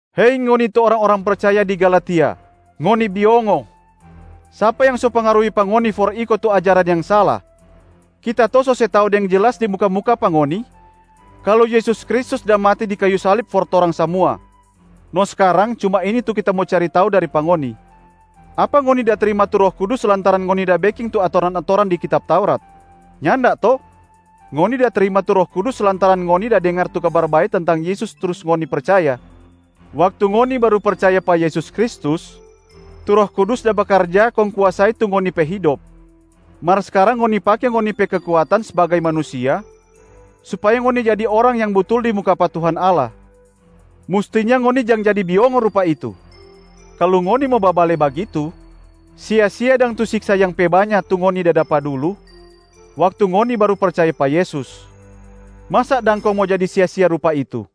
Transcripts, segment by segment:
Hei ngoni tu orang-orang percaya di Galatia, ngoni biongo. Sapa yang so pengaruhi pa ngoni for iko tu ajaran yang sala? Kita to so se tau deng jelas di muka-muka pa ngoni kalu Yesus Kristus da mati di kayu salib for torang samua. No skarang cuma ini tu kita mo cari tau dari pa ngoni: apa ngoni da trima tu Roh Kudus lantaran ngoni da beking tu atoran-atoran di kitab Taurat? Nyanda to? Ngoni da trima tu Roh Kudus lantaran ngoni da dengar tu Kabar Bae tentang Yesus trus ngoni percaya. Waktu ngoni baru percaya pa Yesus Kristus, tu Roh Kudus da bakarja kong kuasai tu ngoni pe hidop, mar skarang ngoni pake ngoni pe kekuatan sbagai manusia supaya ngoni jadi orang yang butul di muka pa Tuhan Allah. Mustinya ngoni jang jadi biongo rupa itu. Kalu ngoni mo babale bagitu, sia-sia dang tu siksa yang pe banya tu ngoni da dapa dulu waktu ngoni baru percaya pa Yesus. Masa dang kong mo jadi sia-sia rupa itu.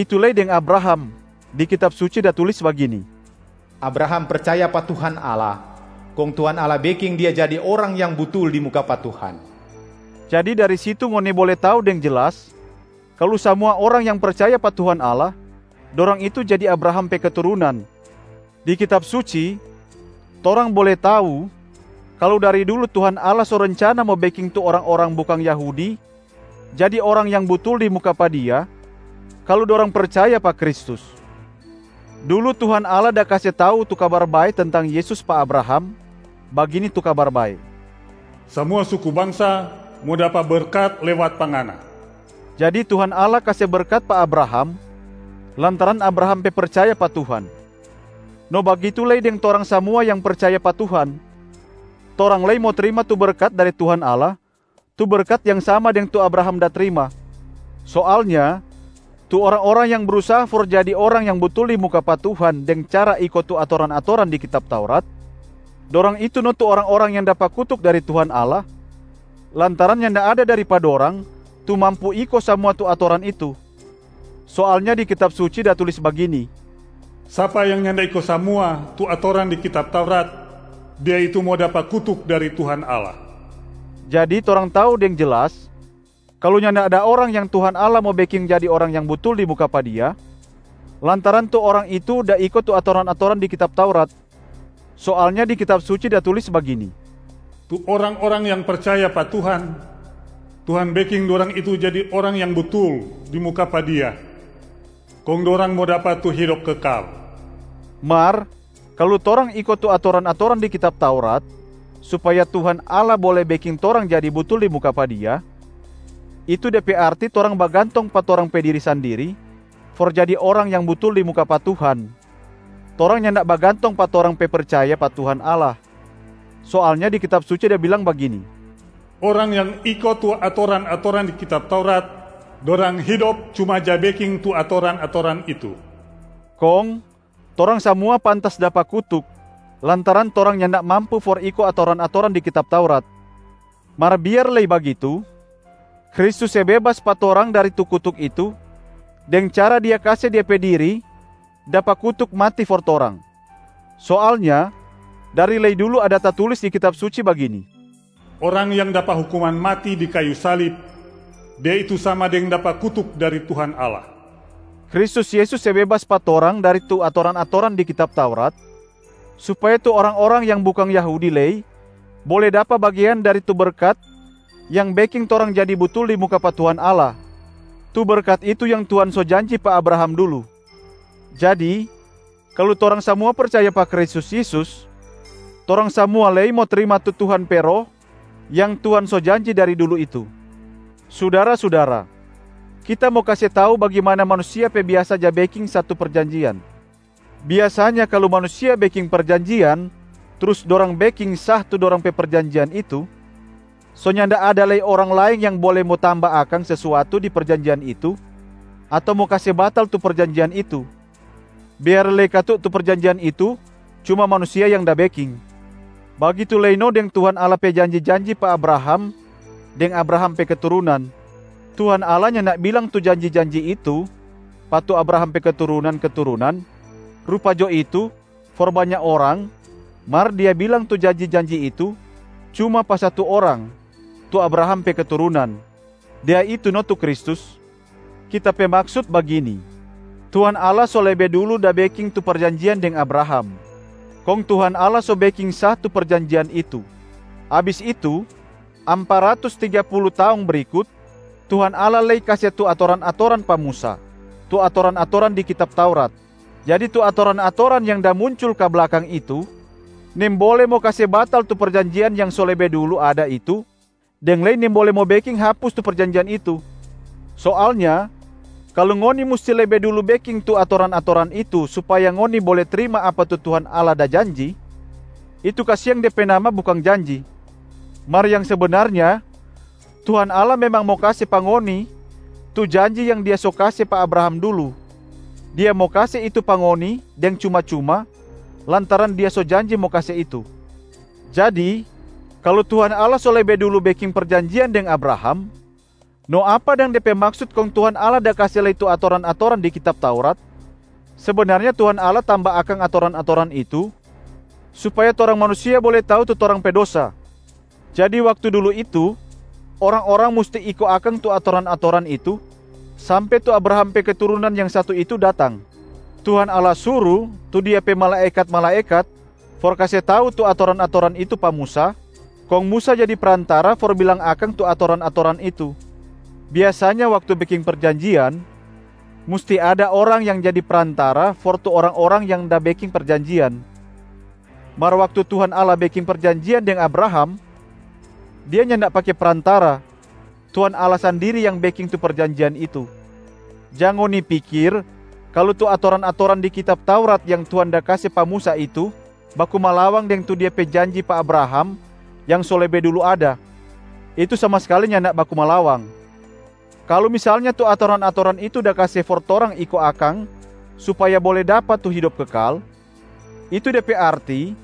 Bagitu lei deng Abraham, di Kitab Suci da tulis bagini, “Abraham percaya pa Tuhan Allah, kong Tuhan Allah beking dia jadi orang yang butul di muka pa Tuhan.” Jadi dari situ ngoni bole tau deng jelas kalu samua orang yang percaya pa Tuhan Allah, dorang itu jadi Abraham pe keturunan. Di Kitab Suci, torang bole tau kalu dari dulu Tuhan Allah so rencana mo beking tu orang-orang bukang Yahudi jadi orang yang butul di muka pa Dia kalu dorang percaya pa Kristus. Dulu Tuhan Allah da kase tau tu Kabar Bae tentang Yesus pa Abraham, bagini tu Kabar Bae, “Samua suku bangsa mo dapa berkat lewat pa ngana.” Jadi Tuhan Allah kase berkat pa Abraham lantaran Abraham pe percaya pa Tuhan. No bagitu lei deng torang samua yang percaya pa Tuhan, torang lei mo trima tu berkat dari Tuhan Allah, tu berkat yang sama deng tu Abraham da trima. Soalnya tu orang-orang yang brusaha for jadi orang yang butul di muka pa Tuhan deng cara iko tu atoran-atoran di kitab Taurat, dorang itu no tu orang-orang yang dapa kutuk dari Tuhan Allah lantaran nyanda ada dari pa dorang tu mampu iko samua tu atoran itu. Soalnya di Kitab Suci da tulis bagini, “Sapa yang nyanda iko samua tu atoran di kitab Taurat, dia itu mo dapa kutuk dari Tuhan Allah.” Jadi torang tau deng jelas kalu nyanda ada orang yang Tuhan Allah mo beking jadi orang yang butul di muka pa Dia lantaran tu orang itu da iko tu atoran-atoran di kitab Taurat. Soalnya di Kitab Suci da tulis bagini, “Tu orang-orang yang percaya pa Tuhan, Tuhan beking dorang itu jadi orang yang butul di muka pa Dia kong dorang mo dapa tu hidop kekal.” Mar kalu torang iko tu atoran-atoran di kitab Taurat supaya Tuhan Allah bole beking torang jadi butul di muka pa Dia, itu de pe arti torang bagantong pa torang pe diri sandiri for jadi orang yang butul di muka pa Tuhan, torang nyanda bagantong pa torang pe percaya pa Tuhan Allah. Soalnya di Kitab Suci da bilang bagini, “Orang yang iko tu atoran-atoran di kitab Taurat, dorang hidop cuma ja beking tu atoran-atoran itu.” Kong torang samua pantas dapa kutuk lantaran torang nyanda mampu for iko atoran-atoran di kitab Taurat. Mar biar lei bagitu, Kristus se bebas pa torang dari tu kutuk itu deng cara Dia kase Dia pe diri dapa kutuk mati for torang. Soalnya dari lei dulu ada tatulis di Kitab Suci bagini, “Orang yang dapa hukuman mati di kayu salib, dia itu sama deng dapa kutuk dari Tuhan Allah.” Kristus Yesus se bebas pa torang dari tu atoran-atoran di kitab Taurat supaya tu orang-orang yang bukang Yahudi lei bole dapa bagean dari tu berkat yang beking torang jadi butul di muka pa Tuhan Allah, tu berkat itu yang Tuhan so janji pa Abraham dulu. Jadi, kalu torang samua percaya pa Kristus Yesus, torang samua lei mo trima tu Tuhan pe Roh yang Tuhan so janji dari dulu itu. Sudara-sudara, kita mo kase tau bagimana manusia pe biasa ja beking satu perjanjian. Biasanya kalu manusia beking perjanjian trus dorang beking sah tu dorang pe perjanjian itu, so nyanda ada lei orang laeng yang bole mo tamba akang sesuatu di perjanjian itu ato mo kase batal tu perjanjian itu, biar lei katu tu perjanjian itu cuma manusia yang da beking. Bagitu lei no deng Tuhan Allah pe janji-janji pa Abraham deng Abraham pe keturunan. Tuhan Allah nyanda bilang tu janji-janji itu pa “tu Abraham pe keturunan-keturunan,” rupa jo itu for banya orang mar Dia bilang tu janji-janji itu cuma pa satu orang “tu Abraham pe keturunan,” Dia itu no tu Kristus. Kita pe maksut bagini: Tuhan Allah so lebe dulu da beking tu perjanjian deng Abraham, kong Tuhan Allah so beking sah tu perjanjian itu. Abis itu, ampa ratus tiga pulu taong brikut, Tuhan Allah lei kase tu atoran-atoran pa Musa, tu atoran-atoran di kitab Taurat. Jadi tu atoran-atoran yang da muncul ka blakang itu nimbole mo kase batal tu perjanjian yang so lebe dulu ada itu deng lei nimbole mo beking hapus tu perjanjian itu. Soalnya kalu ngoni musti lebe dulu beking tu atoran-atoran itu supaya ngoni bole trima apa tu Tuhan Allah da janji, itu kasiang de pe nama bukang janji. Mar yang sebenarnya Tuhan Allah memang mo kase pa ngoni tu janji yang Dia so kase pa Abraham dulu, Dia mo kase itu pa ngoni deng cuma-cuma lantaran Dia so janji mo kase itu. Jadi kalu Tuhan Allah so lebe dulu beking perjanjian deng Abraham, no apa dang de pe maksut kong Tuhan Allah da kase lei tu atoran-atoran di kitab Taurat? Sebenarnya Tuhan Allah tamba akang atoran-atoran itu supaya torang manusia bole tau tu torang pe dosa. Jadi waktu dulu itu, orang-orang musti iko akang tu atoran-atoran itu sampe tu Abraham pe keturunan yang satu itu datang. Tuhan Allah suru tu Dia pe malaekat-malaekat for kase tau tu atoran-atoran itu pa Musa, kong Musa jadi prantara for bilang akang tu atoran-atoran itu. Biasanya waktu beking perjanjian, musti ada orang yang jadi prantara for tu orang-orang yang da beking perjanjian. Mar waktu Tuhan Allah beking perjanjian deng Abraham, Dia nyanda pake prantara, Tuhan Allah sandiri yang beking tu perjanjian itu. Jang ngoni pikir kalu tu atoran-atoran di kitab Taurat yang Tuhan da kase pa Musa itu baku malawang deng tu Dia pe janji pa Abraham yang so lebe dulu ada, itu sama skali nyanda baku malawang. Kalu misalnya tu atoran-atoran itu da kase for torang iko akang supaya bole dapa tu hidop kekal, itu de pe arti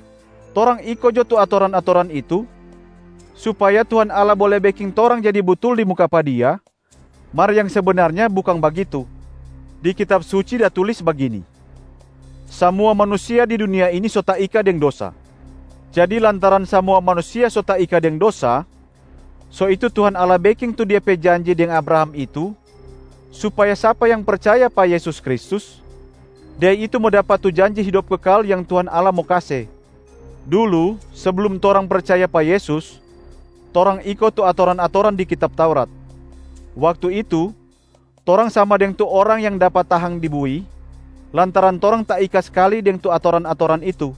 torang iko jo tu atoran-atoran itu supaya Tuhan Allah bole beking torang jadi butul di muka pa Dia, mar yang sebenarnya bukang bagitu. Di Kitab Suci da tulis bagini, “Samua manusia di dunia ini so taika deng dosa.” Jadi lantaran samua manusia so taika deng dosa, so itu Tuhan Allah beking tu Dia pe janji deng Abraham itu supaya sapa yang percaya pa Yesus Kristus, dia itu mo dapa tu janji hidop kekal yang Tuhan Allah mo kase. Dulu seblum torang percaya pa Yesus, torang iko tu atoran-atoran di kitab Taurat. Waktu itu, torang sama deng tu orang yang dapa tahang di bui, lantaran torang taika skali deng tu atoran-atoran itu.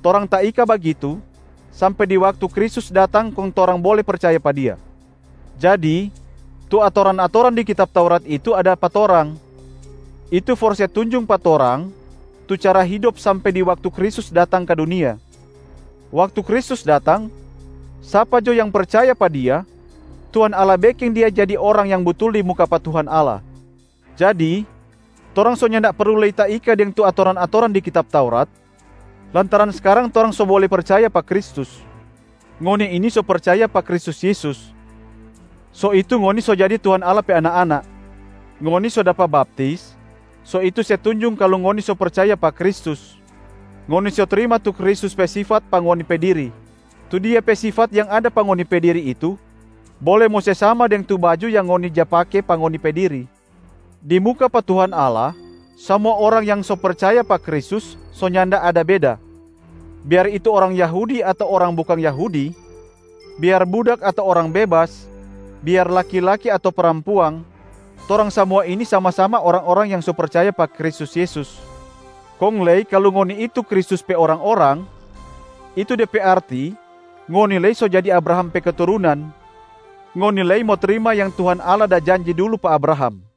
Torang taika bagitu sampe di waktu Kristus datang kong torang bole percaya pa Dia. Jadi tu atoran-atoran di kitab Taurat itu ada pa torang, itu for se tunjung pa torang tu cara hidop sampe di waktu Kristus datang ka dunia. Waktu Kristus datang, sapa jo yang percaya pa Dia, Tuhan Allah beking dia jadi orang yang butul di muka pa Tuhan Allah. Jadi torang so nyanda perlu lei taika deng tu atoran-atoran di kitab Taurat, lantaran skarang torang so bole percaya pa Kristus. Ngoni ini so percaya pa Kristus Yesus, so itu ngoni so jadi Tuhan Allah pe anak-anak. Ngoni so dapa baptis, itu se tunjung kalu ngoni so percaya pa Kristus, ngoni so trima tu Kristus pe sifat pa ngoni pe diri. Tu Dia pe sifat yang ada pa ngoni pe diri itu bole mo se sama deng tu baju yang ngoni ja pake pa ngoni pe diri. Di muka pa Tuhan Allah, samua orang yang so percaya pa Kristus so nyanda ada beda: biar itu orang Yahudi ato orang bukang Yahudi, biar budak ato orang bebas, biar laki-laki ato parampuang, torang samua ini sama-sama orang-orang yang so percaya pa Kristus Yesus. Kong lei kalu ngoni itu Kristus pe orang-orang, itu de pe arti ngoni lei so jadi Abraham pe keturunan, ngoni lei mo trima yang Tuhan Allah da janji dulu pa Abraham.